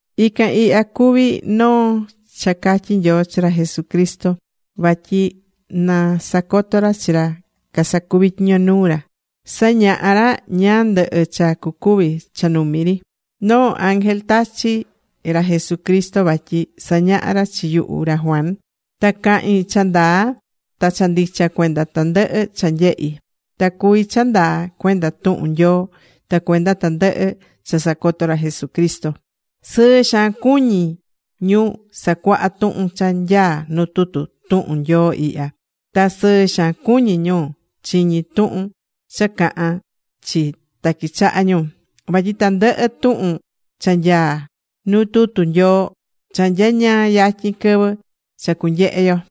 Ican ihya cuví noo cha catyi̱ Nyoo chi ra Jesucristo vatyi na sacoto ra chi ra casacuví tyiño nuu ra. Sañaha̱ ra ñáá ndɨhɨ cha cucuvi cha numi ri. Noo ángel tachi̱ ra Jesucristo vatyi sañaha ra chi yuhu ra Juan. Ta cahín cha ndaa ta cha ndicha cuenda tandɨhɨ cha nyehi̱. Ta cuví cha ndaa cuenda tuhun Nyoo ta cuenda tandɨhɨ cha sacoto̱ ra Jesucristo. Sɨɨ xaan cuñí ñu sacuaha tuhun cha nyaá nu tutu tuhun Nyoo ihya. Ta sɨɨ xaan cuñí ñu chiñí tuhun cha cahán chi ta quichahá ñu, vatyi tandɨhɨ tuhun cha nyaá nuu tutu Nyoo, cha nyañaa yatyin quɨvɨ cha cunyehe yo.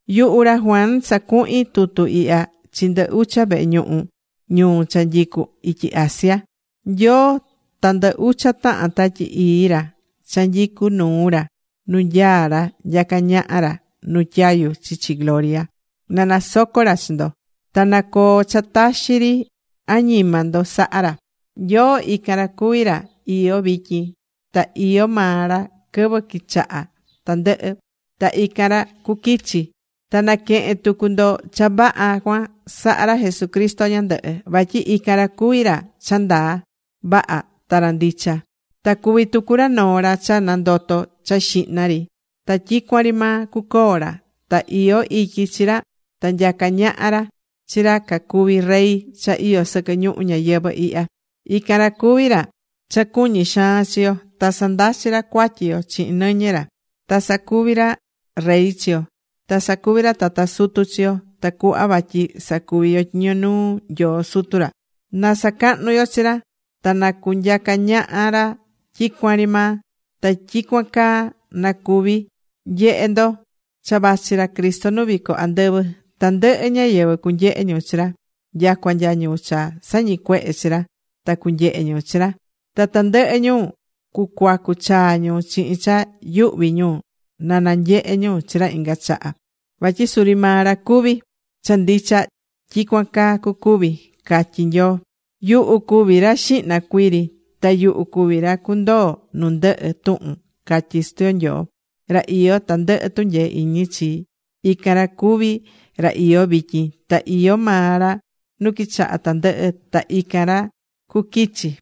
Yuhu ra Juan sacuhín tutu ihya chi ndɨ ucha vehe ñuhu ñuu cha nyicú ityi Asia. Nyoo ta ndɨ ucha tahan Tatyi Ii ra cha nyicú nuu ra nu nyaá ra nyacá ñaha ra nu tyayu chichi gloria, na nasoco ra chi ndo. Ta na coo cha taxi ri añima ndo sahá ra. Nyoo ican ra cuví ra iyó vityin, ta iyó maa ra quɨvɨ quichaha̱ tandɨhɨ, ta ican ra cuquichi. Ta naquehen tucu ndo cha vaha cuan sahá ra Jesucristo ñandɨhɨ. Vatyi ican ra cuví ra cha ndaa vaha ta ra ndicha. Ta cuví tucu ra noo ra cha nandoto̱ cha xihna ri ta tyicuan ri maa cucoo ra. Ta iyó ityi chi ra ta nyacá ñaha ra chi ra cacuví rey cha iyó sɨquɨ ñuhu ñayɨvɨ̱ ihya. Ican ra cuví ra cha cuñí xaan chi yo. Ta sandachi̱ ra cuatyi yo chihin nɨñɨ ra. Ta sacuvi̱ ra rey chi yo. Ta sacuvi̱ ra tata sutu chi yo tacuhva vatyi sacuvi yo tyiño nuu Nyoo Sutu ra. ¡Na sacahnu yo chi ra. Ta na cunyaca ñaha ra tyicuan ri maa! Ta tyicuan caa na cuvi. ¡Nyehe ndo! ¡Cha vachi ra Cristo nu vico andɨvɨ! Tandɨhɨ ñáyɨvɨ cunyehe ñu chi ra. Nyacua nya ñu cha sañicuehe̱ chi ra ta cunyehe ñu chi ra. Ta tandɨhɨ ñu cucuacu chaa ñu chihin cha yuhví ñu na nanyehe ñu chi ra inga chaha vatyi suri maa ra cuví. Cha ndicha, tyicuan caa cucuvi. Catyí Nyoo: ―Yuhu cuví ra xihna cuiri, ta yuhu cuví ra cundoo nu ndɨhɨ tuhun ―catyí Sutu yo Nyoo, ra iyó tandɨhɨ tunyee iñi chi. Ican ra cuví ra iyó vityin. Ta iyó maa ra nu quichaha̱ tandɨhɨ, ta ican ra cuquichi.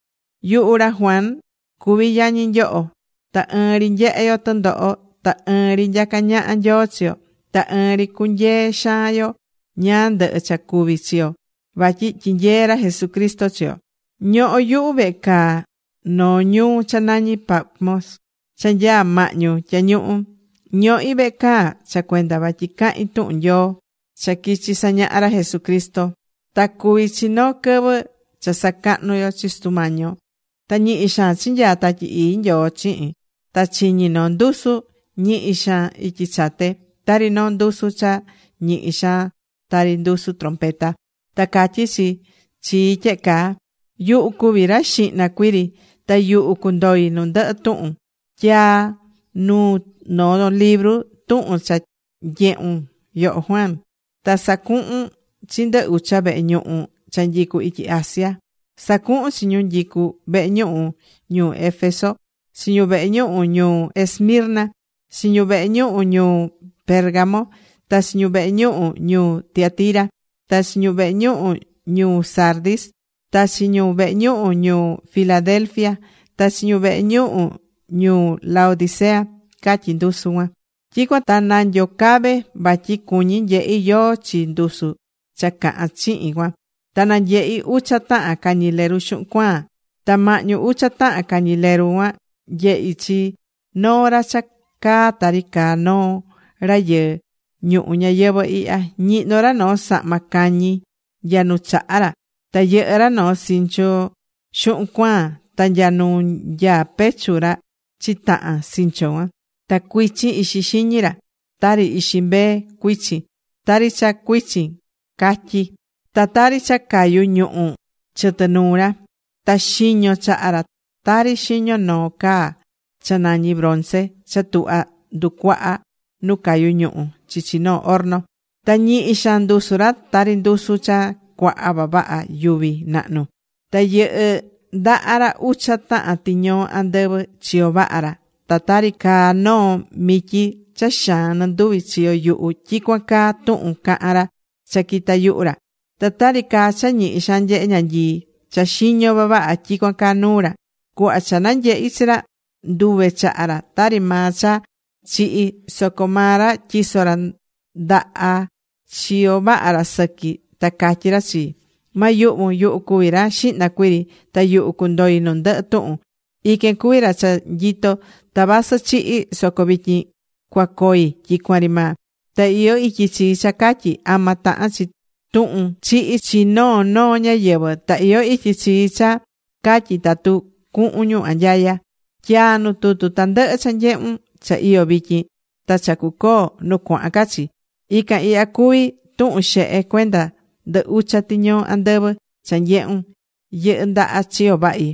Yuhu ra Juan cuví yañi nyoho. Ta ɨɨn ri nyehé yo tɨndoho. Ta ɨɨn ri nyacá ñaha Nyoo chi yo. Ta ɨɨn ri cunyee xaan yo ñáá ndɨhɨ cha cuví chi yo vatyi tyinyeé ra Jesucristo chi yo. Ñoho̱ yuhu vehe caa noo ñuhú cha nañí Patmos cha nyaá mahñu tyañuhu. Ñohi̱ vehe caa cha cuenda vatyi cahín tuhun Nyoo cha quichi̱ sañaha ra Jesucristo. Ta cuvi̱ chi noo quɨvɨ cha sacahnú yo chi Sutu mañí yo. Ta ñihi xaan chinyaa̱ Tatyi Ii Nyoo chihin. Ta chiñi̱ noo ndusu ñihi xaan ityi chate, tari noo ndusu cha ñihi xaan tari ndusu trompeta. Ta catyí chi chii tyehe caa: ―Yuhu cuví ra xihna cuiri, ta yuhu cundoi nu ndɨhɨ tuhun. Tyaa̱ nuu noo libru tuhun cha nyehun, yoho Juan. Ta sa̱cuhun chi ndɨ ucha vehe ñuhu cha nyicú ityi Asia. Sa̱cuhun chi ñu nyicú vehe ñuhu ñuu Éfeso, chi ñu vehe ñuhu ñuu Esmirna, chi ñu vehe ñuhu ñuu Pérgamo, ta chi ñu vehe ñuhu ñuu Tiatira, ta chi ñu vehe ñuhu ñuu Sardis, ta chi ñu vehe ñuhu ñuu Filadelfia, ta chi ñu vehe ñuhu ñuu Laodicea ―catyí ndusu cuan. Tyicuan ta nanyocave̱ vatyi cuñí nyehí yóó chi ndusu cha cahán chihin cuan. Ta nanyehi̱ ucha tahan cañileru xuhun cuaan. Ta mahñu ucha tahan cañileru cuan, nyehi̱ chi noo ra cha caá tari caá noo rayɨɨ ñuhu ñayɨvɨ̱ ihya. Ñihnó ra noo sahma cañi nya nu chaha ra. Ta yɨhɨ́ ra noo sinchu xuhun cuaan, ta nya nu nyaá pechu ra chitahan sinchu cuan. Ta cuichin ixi xiñi ra, tari ixi mbee cuichin, tari cha cuichin catyi. Ta tari cha cayú ñuhu̱ chɨtɨ nuu ra. Ta xiñó chaha ra tari xiñó noo caa cha nañí bronce cha tuhva nducuaha nu cayú ñuhu̱ chichi noo horno. Ta ñihi xaan ndusu ra tari ndusu cha cuaha vavaha yuvi nahnu. Ta yɨhɨ́ ndaha ra ucha tahan tiñoo andɨvɨ chiyo vaha ra. Ta tari caa noo mityi cha xaan nɨnduvi chiyo yuhu, (tyicuan caa tuhun cahán ra cha quitá yuhu ra). Ta tari caá cha ñihi xaan nyehé ñanyii cha xiñó vavaha, tyicuan caá nuu ra. Cuhva cha nanyehi̱ chi ra, nduve̱ chaha ra tari maa cha chihi̱. Soco maa ra tyiso̱ ra ndaha chiyo vaha ra sɨqui, ta catyí ra chii: ―Ma yuhvun. Yuhu cuví ra xihna cuiri, ta yuhu cundoi nu ndɨhɨ tuhun. Iquen cuví ra cha nyitó. Ta vasɨ chihi̱ soco vityin cuacoi tyicuan ri maa. Ta iyó ityi chii cha catyi ama tahan chi tuhun chihi chi noo noo ñáyɨvɨ, ta iyó ityi chii cha catyi tatu cuhun ñu anyaya. Tya̱a nu libru tandɨhɨ cha nyehún, cha iyó vityin, ta cha cucoo nu cuahan ca chi. Ican ihya cuví tuhun xehe cuenda ndɨ ucha tiñoo andɨvɨ cha nyehún yɨhɨ́ ndaha chiyo vahi,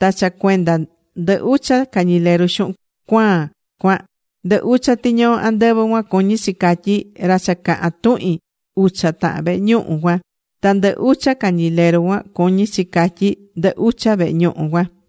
ta cha cuenda ndɨ ucha cañileru xuhun cuaan cuan: Ndɨ ucha tiñoo andɨvɨ cuan cuñí chi catyi: ra cha cahán tuhin ucha tahan vehe ñuhu cuan. Ta ndɨ ucha cañileru cuan cuñí chi catyí ndɨ ucha vehe ñuhu cuan.